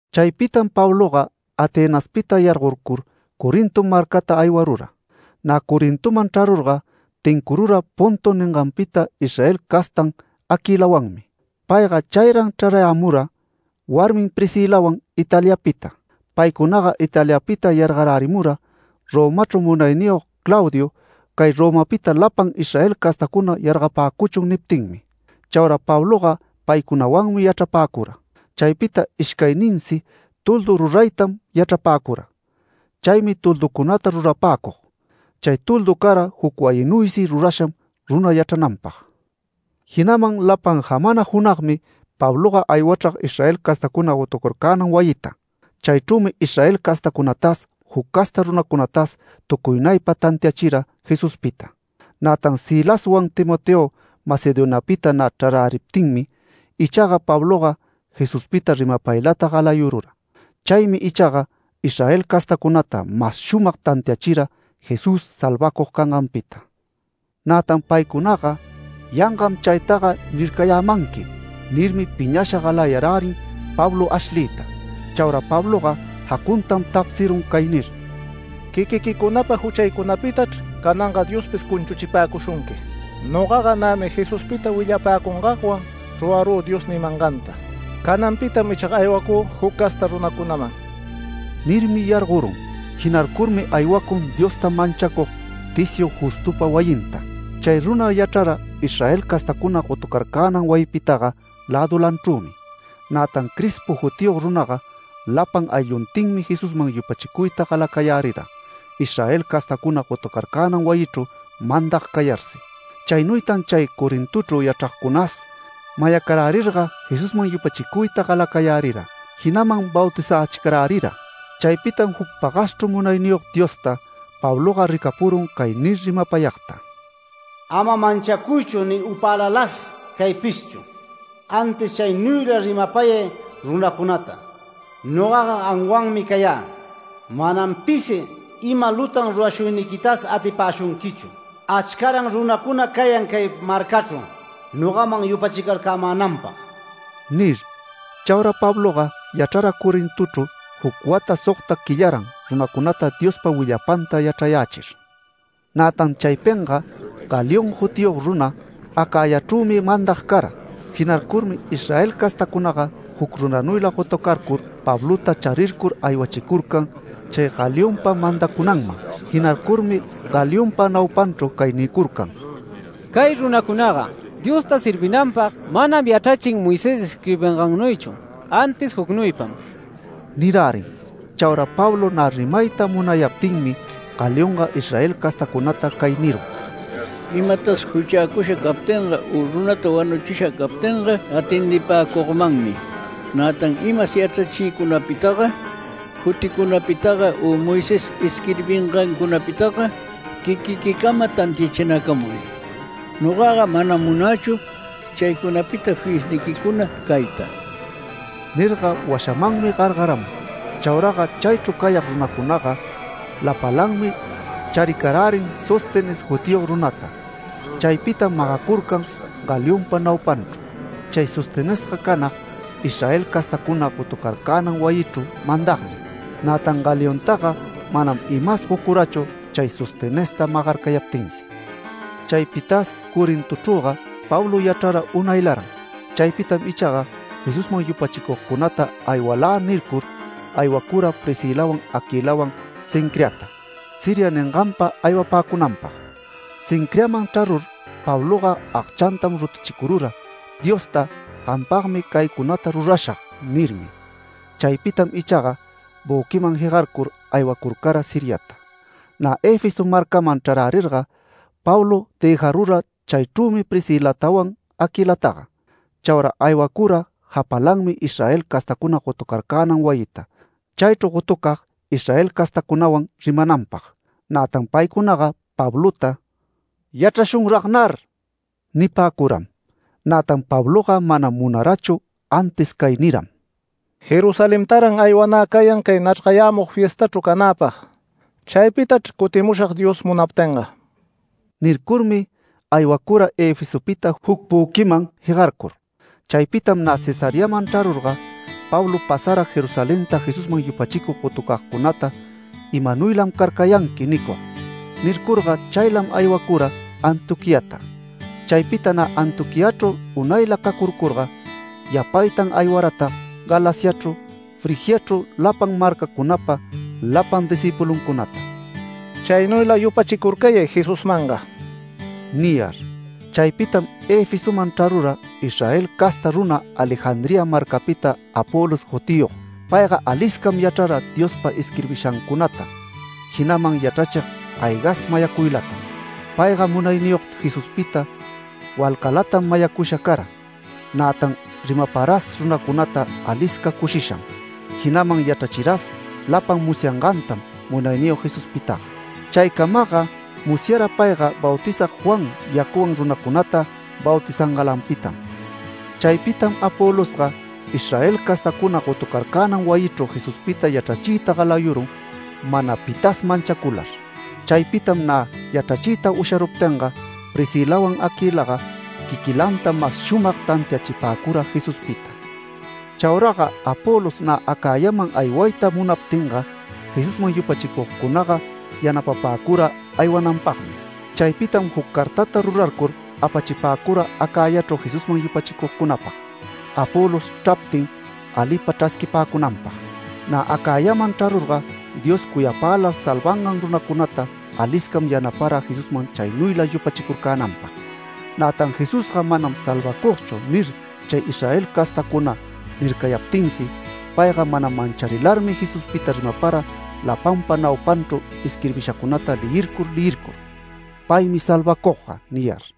Chaypitam Pabloga Atenaspita yargorcur Corinto marcata aywarura. Nä Corintoman chrarurga, tincurura Ponto ninganpita Israel castan Aquilawanmi. Payga chayran chrarayämura warmin Priscilawan Italiapita. Paycunaga Italiapita yargarärimura Romachru munayniyog Claudio “Cay Romapita lapan Israel castacuna yargapäcuchun” niptinmi. Chaura Pabloga paycunawanmi yachrapäcura. Chaypita ishcayninsi toldu ruraytam yachrapäcura, chaymi tolducunata rurapäcug. (Chay toldu cara juc wayinuysi rurasham runa yachrananpag.) Jinaman lapan jamana junagmi Pabloga aywachrag Israel castacuna gotucarcänan wayita. Chaychrümi Israel castacunatas, juc casta runacunatas tucuynaypa tantiachira Jesuspita. Nätan Silaswan Timoteo Macedoniapita nä chraräriptinmi ichaga, Pabloga Jesuspita rimapaylata galayurura. Chaymi ichaga Israel castacunata mas shumag tantiachira Jesús salvacug canganpita. Nätan paycunaga “Yangam chaytaga nircayämanqui” nirmi, piñasha galayarärin Pablo ashliyta. Chaura Pabloga jacuntam tapsirun cay nir: “Quiquiquicunapa juchaycunapitachr cananga Diospis cunchuchipäcushunqui. Nogaga nämi Jesuspita willapäcungagwan rurarü Dios nimanganta. Cananpitam ichaga aywacü juc casta runacunaman”. Nirmi yargorun. Jinarcurmi aywacun Diosta manchacug Ticio Justopa wayinta. Chay runa yachrara Israel castacuna gotucarcänan wayipitaga lädulanchrümi. Nätan Crispo jutiyog runaga lapan aylluntinmi Jesusman yupachicuyta galacayärira Israel castacuna gotucarcänan wayichru mandag cayarsi. Chaynuytan chay Corintochru yachragcunas mayacarärirga Jesusman yupachicuyta galacayärira, jinaman bautizächicarärira. Chaypitam juc pagaschru Munayniyog Diosta, Pabloga ricapurun cay nir rimapayagta: “Ama manchacuychu ni upälalas caypishchu, antis chaynuyla rimapayay runacunata. Nogaga gamwanmi cayä. Manam pisi ima lutan rurashuyniquitasi atipäshunquichu. Achcaran runäcuna cayan cay marcachru nogaman yupachicarcämänanpag” nir. Chaura Pabloga yachrara Corintochru juc wata sogta quillaran runacunata Diospa willapanta yachrayächir. Nätan chaypinga Galión jutiyog runa, Acayachrümi mandag cara. Jinarcurmi Israel castacunaga juc runanuyla gotucarcur Pablota charircur aywachicurcan chay Galionpa mandacunanman. Jinarcurmi Galionpa naupanchru cay nicurcan: “Cay runacunaga Diosta servinanpag manam yachrachin Moisés isquirbingannuychu, antis jucnuypam” nirärin. Chaura Pablo nä rimayta munayaptinmi Galionga Israel castacunata cay nirun: “Imatas juchäcusha captinga u runata wanuchisha captinga atendipäcugmanmi. Nätan imas yachrachiycunapitaga, juticunapitaga u Moisés isquirbingancunapitaga quiquiquicama tantiachinacamuy. Nogaga manam munächu chaycunapita fiyisniquicuna cayta”. Nirga washamanmi gargaramun. Chauraga chaychru cayag runacunaga lapalanmi charicarärin Sóstenes jutiyog runata. Chaypitam magacurcan Galionpa naupanchru. Chay Sostenesga canag Israel castacuna gotucarcänan wayichru mandagmi. Nätan Galiontaga manam imas gocurachu chay Sostenesta magarcayaptinsi. Chaypitas Corintochrüga Pablo yachrara unaylaran. Chaypitam ichaga, Jesusman yupachicugcunata “Aywalä” nircur, aywacura Priscilawan Aquilawan Cencreata, Siria ninganpa aywapäcunanpag. Cencreaman chrarur Pabloga agchantam rutuchicurura Diosta “Gampagmi caycunata rurashag” nirmi. Chaypitam ichaga büquiman jegarcur aywacurcara Siriata. Nä Efeso marcaman chrarärirga, Pablo dëjarura chaychrümi Priscilatawan Aquilataga. Chaura aywacura japalanmi Israel castacuna gotucarcänan wayita, chaychru gotucag Israel castacunawan rimananpag. Nätan paycunaga Pablota “Yachrashunragnar” nipäcuram. Nätan Pabloga manam munarachu, antis cay niram: “Jerusalentaran aywanä cayan cay nachrgayämug fiestachru canäpag. Chaypitachr cutimushag Dios munaptinga” nircurmi, aywacura Efesopita juc büquiman jegarcur. Chaypitam nä Cesareaman chrarurga, Pablo pasara Jerusalenta Jesusman yupachicug gotucagcunata “Imanuylam carcayanqui” nicug. Nircurga chaylam aywacura Antioquiata. Chaypita nä Antioquiachru unayla cacurcurga, yapaytan aywaratag Galaciachru, Frigiachru lapan marcacunapa, lapan discïpulucunata “Chaynuyla yupachicurcayay Jesusmanga” niyar. Chaypitam Efesoman chrarura Israel casta runa Alejandría marcapita Apolos jutiyog. Payga aliscam yachrara Diospa isquirbishacunata, jinaman yachrachig aygas mayacuylatam. Payga Munayniyog Jesuspita walcalatam mayacusha cara. Nätan rimaparas runacunata alisca cushisham, jinaman yachrachiras lapan musyangantam Munayniyog Jesuspitaga. Chaycamaga musyara payga Bautizag Juan yacuwan runacunata bautizangalanpitam. Chaypitam Apolosga Israel castacuna gotucarcänan wayichru Jesuspita yachrachiyta galayurun mana pitas manchacular. Chaypitam nä yachrachiyta usharuptinga, Priscilawan Aquilaga quiquilanta mas shumag tantiachipäcura Jesuspita. Chauraga Apolos nä Acayaman aywayta munaptinga, Jesusman yupachicugcunaga yanapapäcura aywananpagmi. Chaypitam juc cartata rurarcur apachipäcura Acayachru Jesusman yupachicugcunapag, Apolos chraptin, alipa chrasquipäcunanpag. Nä Acayaman chrarurga Dios cuyapälar salvangan runacunata aliscam yanapara Jesusman chaynuyla yupachicurcänanpag. Nätan “Jesusga manam salvacugchu” nir chay Israel castacuna nircayaptinsi, payga mana mancharilarmi Jesuspita rimapara lapanpa naupanchru isquirbishacunata leyircur leyircur “Paymi salvacugga” niyar.